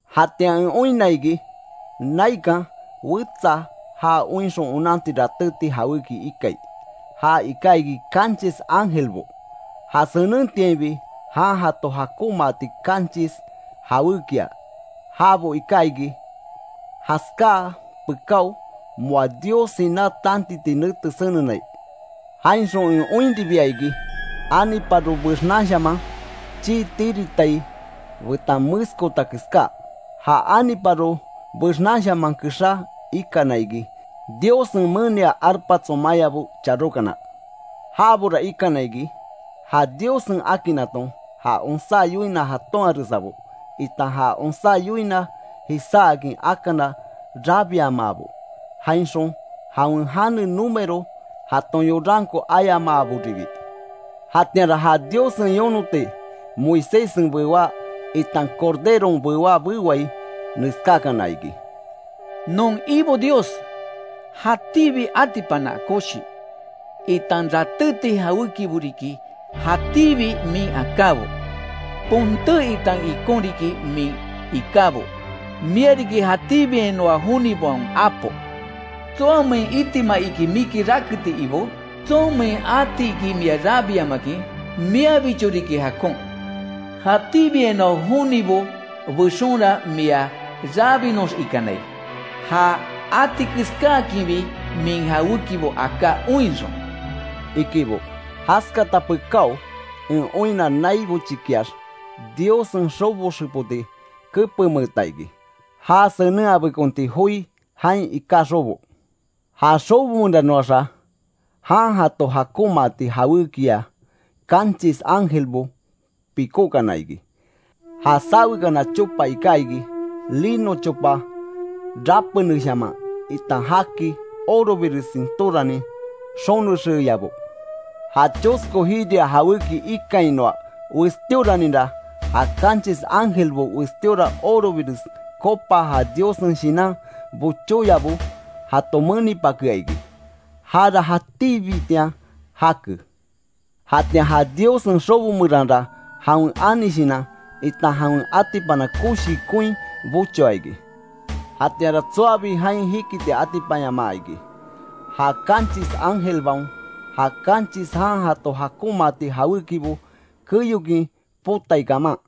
Jatian en oinna iki, naikan wetsa ja oinxon onanti ratéti jawéki ikai. Ja iká iki kanchis ángelbo, ja senentiainbi jan jato jakonmaati kanchis jawékia. Jabo iká iki jaskaa pekáo, moa Dios siná tantiti nete senenai. Jainxon en oinribia iki, aniparo bexnanshaman chii tiritai betan meskota keská. Ja aniparo bexnanshaman kexá ikana iki, Diossen menia arpa tsomayabo charókana. Jabora ikana iki, ja Diossen akinnaton ja onsá yoina jatonharesabo, itan ja onsá yoina jisáakin akana rabiamaabo; jainxon jawen jane número jaton yoranko ayamaaboribi. Jatianra ja Diossen yonoti Moiséssen bewá, itan Corderon bewá bewai neskákana iki: “Non Ibo Dios, jatíbi atipana koshi, itan ratéti jawékibo riki jatíbi min akábo; ponté, itan ikon riki min ikábo. Mia riki jatíbiainoa jonibaon Apo ¿Tsoamein itima iki miki raketi Ibó? ¿Tsonmein atiki mia rabiamakin? Miabicho riki jakon. Jatíbiainoa jonibo bexonra mia rabinoxikanai, ja atikeskaakinbi min jawékibo aká oinxon”, ikibo. Jaskata pekáo en oinna, nai bochikiax Diossen xobo xepoti kepenmeeta iki. Ja senenhabekonti joi jain iká xobo. Ja xobo meranoaxa, jan jato jakonmaati jawékiya kanchis ángelbo pikókana iki. Ja sawekana chopa iká iki, lino chopa rapeneshaman, itan jaki orobires sintóranin xonexeyabo. Ja chosko jiria jawéki ikainoa westíoraninra, ja kanchis ángelbo westíora orobires copa ja Diossen shinan bochóyabo jato menipakea iki. Jara jatíbitian jake. Jatian ja Diossen xobo meranra jawen ani shinan, itan jawen atipana koshi koin bochoa iki. Jatianra tsoabi jain jikiti atipanyamaa iki, ja kanchis ángelbaon ja kanchis jan jato jakonmaati jawékibo keyokin potai kaman.